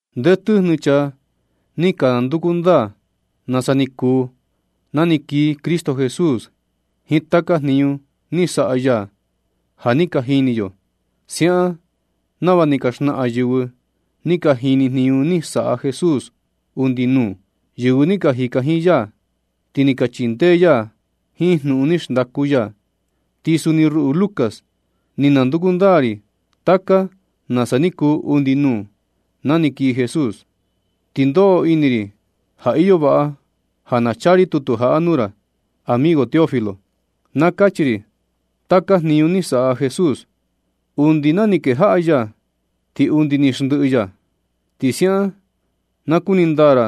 Nde tɨjnɨ chaa ni ka nanduku ndaa nasa ni kuu na ni kii Cristo Jesús jiin taka jniñu ni saꞌa ya, ja ni ka jini yo. Siaꞌan nava ni ka xnaꞌan yɨvɨ ni ka jini jniñu ni saꞌa Jesús undi nuu, yɨvɨ ni ka jika jiin ya ti ni ka chindee ya jiin jnuꞌun ni xndaku ya. Ti suni ruꞌu Lucas, ni nanduku ndaa ri taka nasa ni kuu undi nuu, na ni kii Jesús. Ti ndoꞌo ini ri ja iyo vaꞌa ja na chaa ri tutu jaꞌa nuu ra, amigo Teófilo, na kachi ri taka jniñu ni saꞌa Jesús, undi na ni kejaꞌa ya ti undi ni xndɨꞌɨ ya. Ti siaꞌan na kuni ndaa ra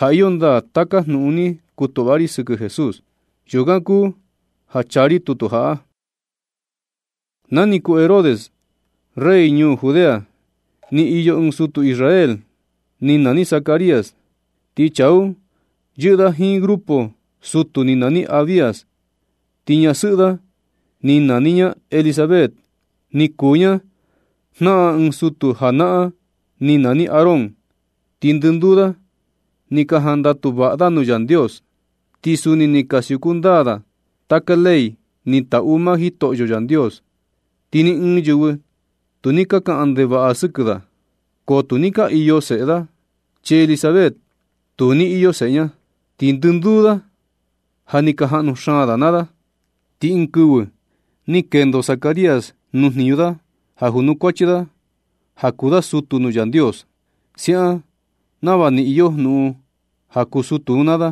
ja iyo ndaa taka jnuꞌun ni kutuꞌva ra sɨkɨ Jesús. Yukan kuu ja chaa ri tutu jaꞌa. Na ni kuu Herodes rey ñuu Judea, ni iyo ɨɨn sutu Israel ni nani Zacarías, ti chaa un yɨꞌɨ da jiin grupo sutu ni nani Abías. Ti ñasɨꞌɨ da ni nani ña Elisabet, ni kuu ña jnaꞌan ɨɨn sutu janaꞌan ni nani Aarón. Ti ndɨnduu da ni ka jandatu vaꞌa da nuu Yandios, ti suni ni ka siuku ndaa da taka ley ni taꞌu maa Jitoꞌyo Yandios. Ti ni ɨɨn yɨvɨ tu ni ka kaꞌan ndevaꞌa i sɨkɨ da. Ko tu ni ka iyo seꞌe da, chi Elisabet tu ni iyo seꞌe ña. Ti ndɨnduu da ja ni ka jaꞌnu xaan da naa da. Ti ɨɨn kɨvɨ ni kendo Zacarías nuu jniñu da ja junukuachi da, ja kuu da sutu nuu Yandios. Siaꞌan nava ni iyo jnuꞌun ja kuu sutu un naa da,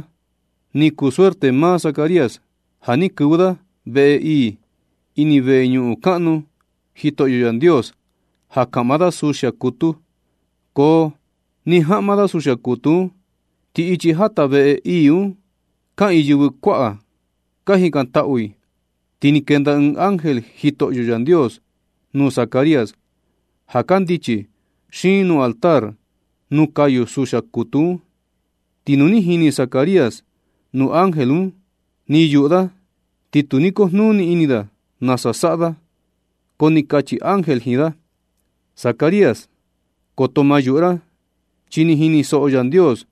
ni kuu suerte maa Zacarías ja ni kɨvɨ da veꞌe ii, ini veñuꞌun kaꞌnu Jitoꞌyo Yandios ja kaꞌma da suxia kutu. Ko ni jaꞌma da suxia kutu un, ti ichi jata veꞌe ii un kaꞌiin yɨvɨ kuaꞌa ka jikantaꞌu i. Ti ni kenda ɨɨn ángel Jitoꞌyo Yandios nuu Zacarías ja kandichi xiin nuu altar nuu kayu suxia kutu un. Ti nu ni jini Zacarías nuu ángel un ni yuꞌu da, ti tu ni kujnuni ini da nasa saꞌa da. Ko ni kachi ángel jiin da: ―Zacarías, koto ma yuꞌu ra, chi ni jinisoꞌo Yandios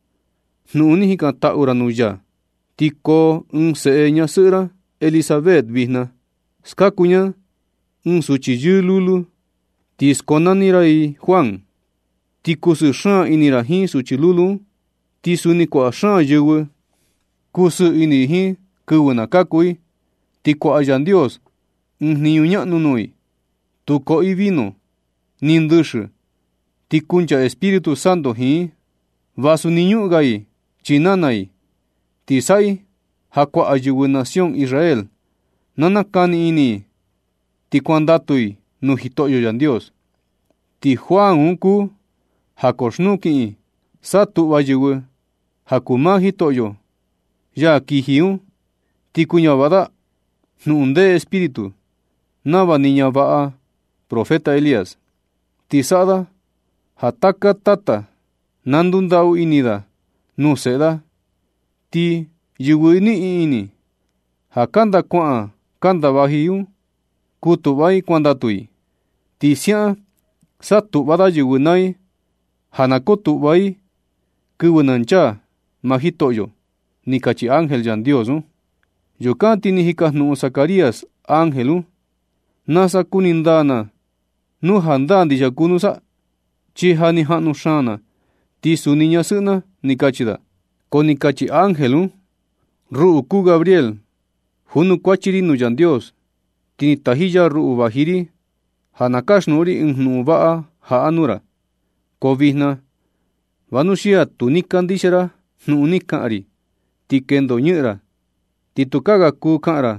jnuꞌun ni jikantaꞌu ra nuu ya, ti koo ɨɨn seꞌe ñasɨꞌɨ ra Elisabet vijna. Skaku ña ɨɨn suchi yɨɨ lulu, ti skonani ra i Juan. Ti kusɨɨ xaan ini ra jiin suchi lulu un, ti suni kuaꞌa xaan yɨvɨ kusɨɨ ini jiin yɨ kɨvɨ na kaku i, ti kuaꞌa Yandios ɨɨn jniñu ñaꞌnu nuu i. Tu koꞌo i vino ni ndɨxɨ, ti kunchaa Espíritu Santo jiin i, vasu ni ñuꞌun ga i chii nana i. Ti saꞌa i ja kuaꞌa yɨvɨ nación Israel na nakani ini i ti kuandatu i nuu Jitoꞌyo Yandios. Ti Juan un kuu ja koxnuu kiꞌin satuꞌva yɨvɨ ja kuu maa Jitoꞌyo, ya kiji un, ti kuñavaꞌa da jnuꞌun nde Espíritu nava ni ñavaꞌa profeta Elías. Ti saꞌa da ja taka tata na ndundaꞌu ini da nuu seꞌe da, ti yɨvɨ niꞌin ini ja kanda kuaꞌan kanda vaji un kutuꞌva i kuandatu i. Ti siaꞌan satuꞌva da yɨvɨ naa i ja na kotuꞌva i kɨvɨ na chaa maa Jitoꞌyo ―ni kachi ángel Yandios un. Yukan ti ni jikajnuꞌun Zacarías ángel un: ―¿Nasa kuni ndaa na nu jandaa ndixia kuu nusa? Chi ja ni jaꞌnu xaan na, ti suni ñasɨꞌɨ na ―ni kachi da. Ko ni kachi ángel un: ―Ruꞌu kuu Gabriél, junukuachi ri nuu Yandios, ti ni taji ya ruꞌu vaji ri ja na kasjnuꞌun ri ɨɨn jnuꞌun vaꞌa jaꞌa nuu ra. Ko vijna, vanuxia tu ni kandixia ra jnuꞌun ni kaꞌan ri, ti kendo ñɨꞌɨn ra, ti tukaa ga kuu kaꞌan ra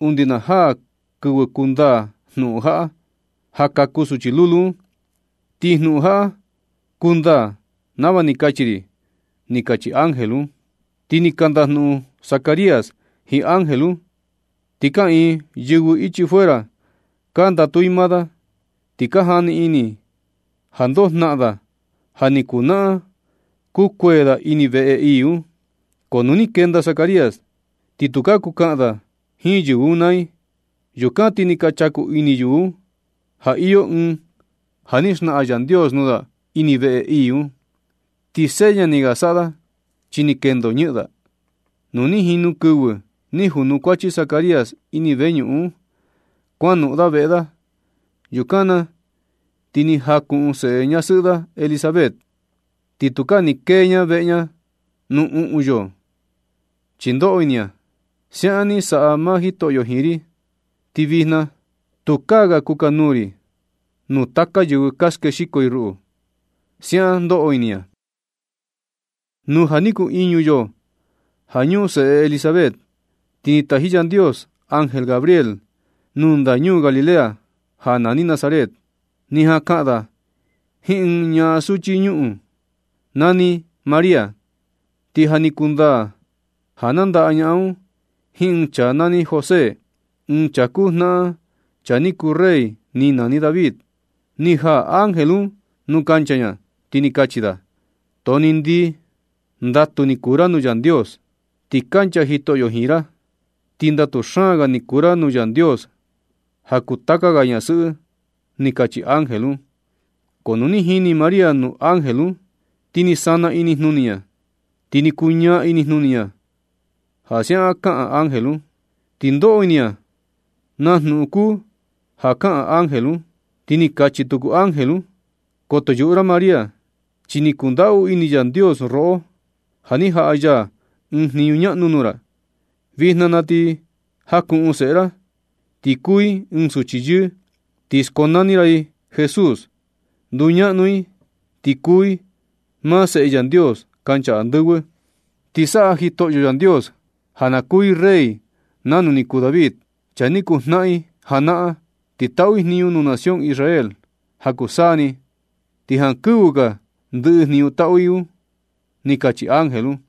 undi na jaa kɨvɨ kundaa jnuꞌun jaꞌa, ja kaku suchi lulu un. Ti jnuꞌun jaꞌa kundaa nava ni kachi ri ―ni kachi ángel un. Ti ni ka ndajnuꞌun Zacarías jiin ángel un, ti kaꞌiin yɨvɨ ichi fuera ka ndatu i maa da, ti ka jani ini i ja ndoo jnaꞌan da ja ni kunaꞌan kukuee da ini veꞌe ii un. Ko nu ni kenda Zacarías, ti tukaa kuu kaꞌan da jiin yɨvɨ un naa i. Yukan ti ni ka chaku ini yɨvɨ un ja iyo ɨɨn ja ni naxnaꞌan Yandios nuu da ini veꞌe ii un. Ti seña ni ga ni saꞌa da chi ni kendo ñɨꞌɨn da. Nu ni jinu kɨvɨ ni junukuachi Zacarías ini veñuꞌun un, ti kuanoꞌon da veꞌe da. Yukan na ti ni jakuꞌun seꞌe ñasɨꞌɨ da Elisabet, ti tukaa ni kee ña veꞌe ña nuu uꞌun yoo, chi ndoꞌo ini ña: “Siaꞌan ni saꞌa maa Jitoꞌyo jiin ri, ti vijna tukaa ga kukanuu ri nuu taka yɨvɨ ja skexiko i ruꞌu”, siaꞌan ndoꞌo ini ña. Nu ja ni kuu iñu yoo ja ñuꞌun seꞌe Elisabet, ti ni taji Yandios ángel Gabriél nuu ndañuu Galilea ja nani Nazaret. Ni jan kaꞌan da jiin ɨɨn ñaꞌan suchi ñuꞌun nani María. Ti ja ni kundaa ja nandaꞌa ñaꞌan un jiin ɨɨn chaa nani José, ɨɨn chaa kuu jnaꞌan chaa ni kuu rey ni nani David. Ni jaa ángel un nuu kancha ña, ti ni kachi da: ―Too ni ndii. Ndatu ni kuu ra nuu Yandios, ti kancha Jitoꞌyo jiin ra, ti ndatu xaan ga ni kuu ra nuu Yandios ja kuu taka ga ñasɨꞌɨ ―ni kachi ángel un. Ko nu ni jini María nuu ángel un, ti ni sana inijnuni ña, ti ni kuñaa inijnuni ña ja siaꞌan kaꞌan ángel un. Ti ndoꞌo ini ña naa jnuꞌun kuu ja kaꞌan ángel un. Ti ni kachi tuku ángel un: ―Koto yuꞌu ra María, chi ni kundaꞌu ini Yandios roꞌo ja ni jaꞌa ya ɨɨn jniñu ñaꞌnu nuu ra. Vijna na ti jakuꞌun seꞌe ra. Ti kuu i ɨɨn suchi yɨɨ, ti skonani ra i Jesús. Nduñaꞌnu i, ti kuu i maa Seꞌe Yandios kancha andɨvɨ. Ti saꞌa Jitoꞌyo Yandios ja na kuu i rey nanu ni kuu David, chaa ni kuu jnaꞌan i janaꞌan. Ti taꞌu i jniñu nuu nación Israel ja kuu saa ni ti jankɨvɨ ga ndɨꞌɨ jniñu taꞌu i un ―ni kachi ángel un.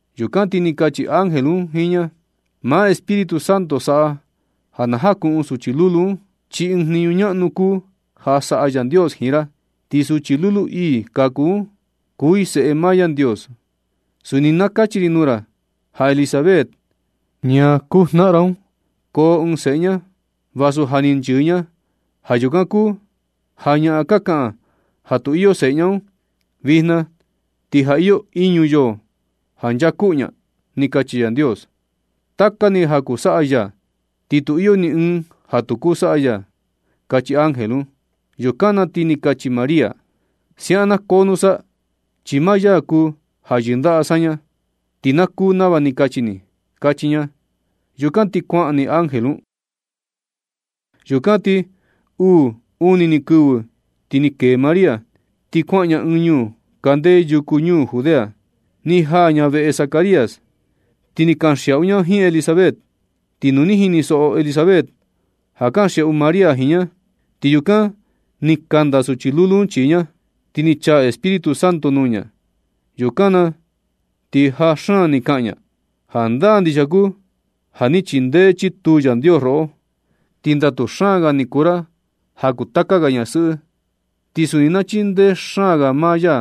Yukan ti ni kachi ángel un jiin ña: ―Maa Espíritu Santo saꞌa ja na jakuꞌun suchi lulu un, chi ɨɨn jniñu ñaꞌnu kuu ja saꞌa Yandios jiin ra. Ti suchi lulu ii ja kaku un, kuu i Seꞌe maa Yandios. Suni na kachi ri nuu ra ja Elisabet, ñaa kuu jnaꞌan ra un, koo ɨɨn seꞌe ña, vasu ja ni nchɨɨ ña. Ja yukan kuu ja ñaꞌan ka kaꞌan ja tu iyo seꞌe un, vijna ti ja iyo iñu yoo ja nchaa kuꞌu ña. Chi Yandios, taka ni ja kuu saꞌa ya, ti tu iyo ni ɨɨn ja tu kuu saꞌa ya ―kachi ángel un. Yukan na ti ni kachi María: ―Siaꞌan na koo nusa, chi maa ya kuu ja yɨndaꞌa saña, ti na kuu nava ni kachi ni ―kachi ña. Yukan na ti kuaꞌan ni ángel un. Yukan ti uu uni ni kɨvɨ ti ni kee María, ti kuaꞌan ña ɨɨn ñuu kande yuku ñuu Judea. Ni jaa ña veꞌe Zacarías, ti ni kanxiaꞌu ña jiin Elisabet. Ti nu ni jinisoꞌo Elisabet ja kanxiaꞌu María jiin ña, ti yukan ni kanda suchi lulu un chii ña, ti ni chaa Espíritu Santo nuu ña. Yukan na ti jaa xaan ni kaꞌan ña: ―Jandaa ndixia kuu ja ni chindee chituu Yandios roꞌo. Ti ndatu xaan ga ni kuu ra ja kuu taka ga ñasɨꞌɨ. Ti suni na chindee xaan ga maa ya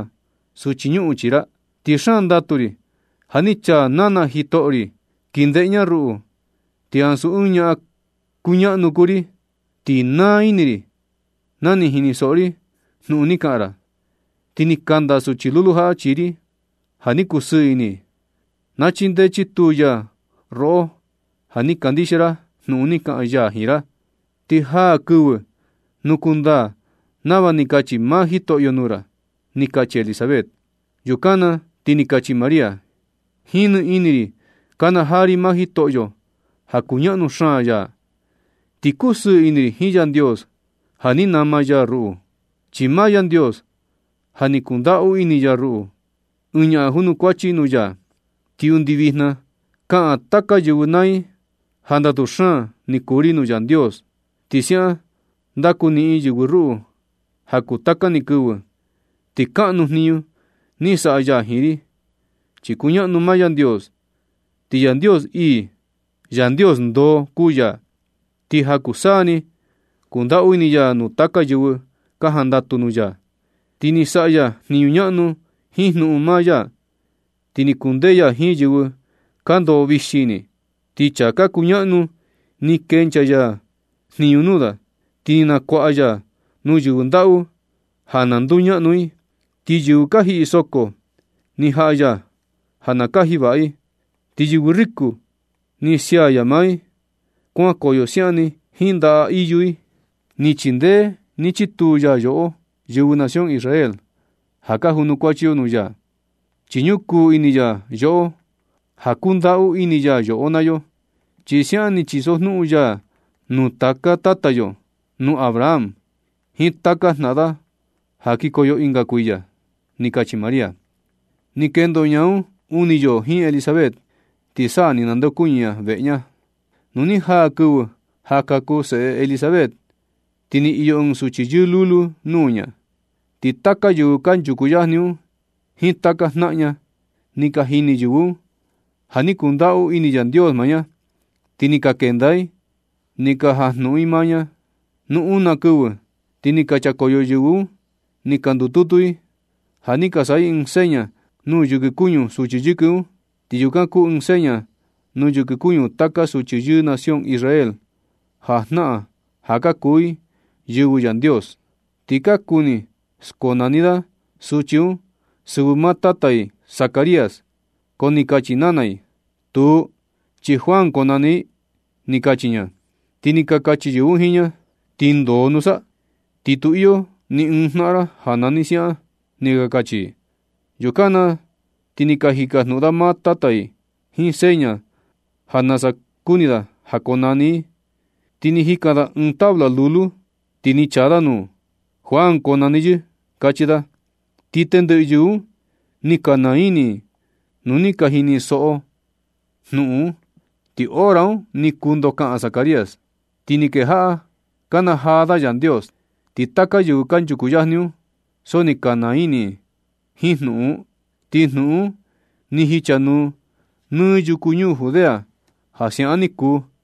suchi ñuꞌun chii ra. Ti xaan ndatu ri ja ni chaa nana Jitoꞌyo ri kii ndeꞌe ña ruꞌu, ti ansu ɨɨn ñaꞌan kuñaꞌnu kuu ri. Ti naa ini ri na ni jinisoꞌo ri jnuꞌun ni kaꞌan ra, ti ni kanda suchi lulu jaꞌa chii ri ja ni kusɨɨ ini i. Na chindee chituu ya roꞌo ja ni kandixia ra jnuꞌun ni kaꞌan ya jiin ra. Ti jaa kɨvɨ nu kundaa nava ni kachi maa Jitoꞌyo nuu ra ―ni kachi Elisabet. Yukan na ti ni kachi María: Jiin ni ini ri kana jaa ri maa Jitoꞌyo ja kuñaꞌnu xaan ya. Ti kusɨɨ ini ri jiin Yandios ja ni nama ya ruꞌu. Chi maa Yandios ja ni kundaꞌu ini ya ruꞌu, ɨɨn ñaꞌan junukuachi nuu ya. Ti undi vijna kaꞌan taka yɨvɨ naa i ja ndatu xaan ni kuu ri nuu Yandios, ti siaꞌan ndaku niꞌin yɨvɨ ruꞌu ja kuu taka ni kɨvɨ. Ti kaꞌnu jniñu ni saꞌa ya jiin ri, chi kuñaꞌnu maa Yandios, ti Yandios ii Yandios ndoo kuu ya. Ti ja kuu saa ni kundaꞌu ini ya nuu taka yɨvɨ ka jandatu nuu ya. Ti ni saꞌa ya jniñu ñaꞌnu jiin jnuꞌun maa ya, ti ni kundee ya jiin yɨvɨ ka ndoꞌo vixi ini. Ti chaa ka kuñaꞌnu ni kenchaa ya jniñu nuu da, ti ni nakuaꞌa ya nuu yɨvɨ ndaꞌu ja na nduñaꞌnu i. Ti yɨvɨ ka jiꞌi soko ni jaꞌa ya ja na kaji vaꞌa i. Ti yɨvɨ riko ni sia ya maa i kuankoyo siaꞌan ni jiin ndaꞌa iyu i. Ni chindee ni chituu ya yoꞌo, yɨvɨ nación Israel, ja ka junukuachi yo nuu ya. Chi ñukuu ini ya yoꞌo ja kundaꞌu ini ya yoꞌo naa yo. Chi siaꞌan ni chisojnuꞌun ya nuu taka tata yo, nuu Abraham jiin taka jnaꞌan da ja kikoyo ɨnga kuiya. Ni kachi María. Ti ni kendo ña uni yoo jiin Elisabet, ti sa ni nandeokuñɨ ña veꞌe ña. Nu ni jaa kɨvɨ ja kaku seꞌe Elisabet, ti ni iyo ɨɨn suchi yɨɨ lulu nuu ña. Ti taka yɨvɨ kanchuku yajni un jiin taka jnaꞌan ña, ni ka jini yɨvɨ un ja ni kundaꞌu ini Yandios maa ña, ti ni ka kenda i ni ka jajnuꞌun i maa ña. Nu una kɨvɨ, ti ni ka chakoyo yɨvɨ un ni ka ndututu i ja ni ka saꞌa i ɨɨn seña nuu yɨkɨ kuñu suchi yɨkɨ un (ti yukan kuu ɨɨn seña nuu yɨkɨ kuñu taka suchi yɨɨ nación Israel, ja jnaꞌan ja ka kuu i yɨvɨ Yandios). Ti ka kuni skonani da suchi un sɨvɨ maa tata i Zacarías. Ko ni kachi nana i: ―Tuu, chi Juan konani i ―ni kachi ña. Ti ni ka kachi yɨvɨ un jiin ña: ―¿Ti ndoo nusa? Ti tu iyo ni ɨɨn jnaꞌan ra ja ni nani siaꞌan ―ni ka kachi i. Yukan na ti ni ka jikajnuꞌun da maa tata i jiin seña ja nasa kuni da ja na konani i. Ti ni jikan da ɨɨn tabla lulu, ti ni chaa da nuu: “Juan konani yɨ”, kachi da. Ti tendɨꞌɨ yɨvɨ un ni ka naa ini i nu ni ka jinisoꞌo i jnuꞌun un. Ti hora un ni kuu ndokaꞌan Zacarías, ti ni kejaꞌa kanajaa da Yandios. Ti taka yɨvɨ kanchuku yajni un, so ni ka naa ini i jiin jnuꞌun un, ti jnuꞌun un ni jichanuu nɨ yuku ñuu Judea ja siaꞌan ni kuu.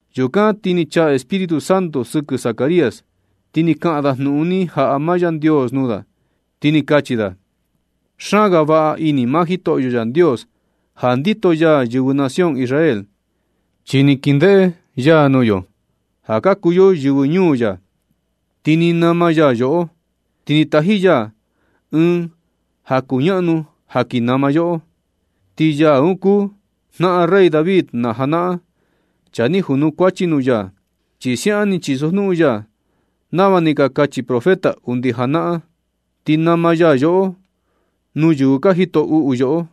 Yukan ti ni chaa Espíritu Santo sɨkɨ Zacarías, ti ni kaꞌan da jnuꞌun ni jaꞌa maa Yandios nuu da, ti ni kachi da: Xaan ga vaꞌa ini maa Jitoꞌyo Yandios ja ndito ya yɨvɨ nación Israel, chi ni kindeꞌe ya nuu yo ja ka kuu yo yɨvɨ ñuu ya, ti ni nama ya yoꞌo. Ti ni taji ya ɨɨn ja kuñaꞌnu ja ki nama yoꞌo. Ti ya un kuu jnaꞌan rey David na janaꞌan, chaa ni junukuachi nuu ya. Chi siaꞌan ni chisojnuꞌun ya nava ni ka kachi profeta undi janaꞌan. Ti nama ya yoꞌo nuu yɨvɨ ka jito uꞌu yoꞌo,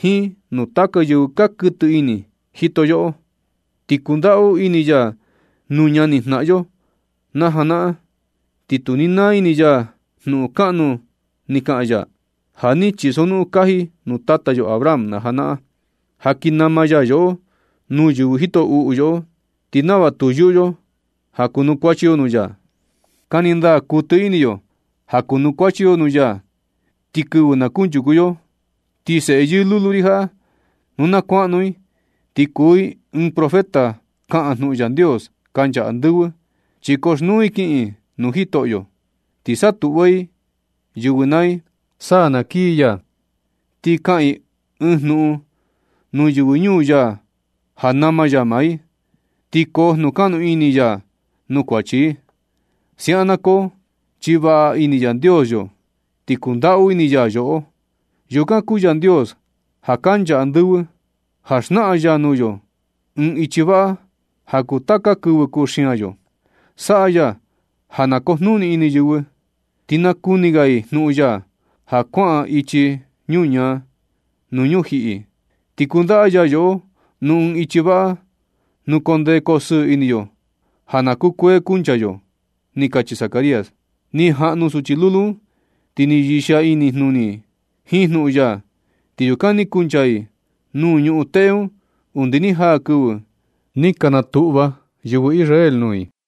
jiin nuu taka yɨvɨ ka kɨtɨ ini jito yoꞌo. Ti kundaꞌu ini ya nuu ñanijnaꞌan yo na janaꞌan, ti tu ni naa ini ya jnuꞌun kanuu ni kaꞌan ya. Ja ni chisojnuꞌun kaji nuu tata yo Abraham na janaꞌan, ja kin nama ya yoꞌo nuu yɨvɨ jito uꞌu yoꞌo, ti nava tu yuꞌu yo ja kuanukuachi yo nuu ya. Kani ndaa kuɨtɨ ini yo ja kunukuachi yo nuu ya nɨ kɨvɨ na kuchaku yo. Ti seꞌe yɨɨ lulu ri jaꞌa, nu na kuaꞌnu i, ti kuu i ɨɨn profeta. Kaꞌan jnuꞌun Yandios kancha andɨvɨ, chi koxnuu i kiꞌin i nuu Jitoꞌyo. Ti satuꞌva i yɨvɨ naa i sa na kii ya. Ti kaꞌan i ɨɨn jnuꞌun nuu yɨvɨ ñuu ya ja nama ya maa i, ti koo jnuꞌun kaꞌnu ini ya nuu kuachi i. Siaꞌan na koo, chi vaꞌa ini Yandios yo, ti kundaꞌu ini ya yoꞌo. Yukan kuu Yandios, ja kancha andɨvɨ, na xnaꞌan ya nuu yo ɨɨn ichi vaꞌa ja kuu taka kɨvɨ kuxian yo. Saꞌa ya ja na kujnuni ini yɨvɨ, ti nakuni ga i jnuꞌun ya, ja kuaꞌan i ichi ñuñaa nuu ñujiꞌi. Ti kundaꞌa ya yoꞌo nuu ɨɨn ichi vaꞌa nuu koo ndee koo sɨɨ ini yo, ja na kukuee kunchaa yo. Ni kachi Zacarías. Ni jaꞌnu suchi lulu un, ti ni yɨxia ini jnuni i jiin jnuꞌun ya. Ti yukan ni kunchaa i nuu ñuꞌun teꞌe un undi ni jaa kɨvɨ ni ka natuꞌva yɨvɨ Israel nuu i.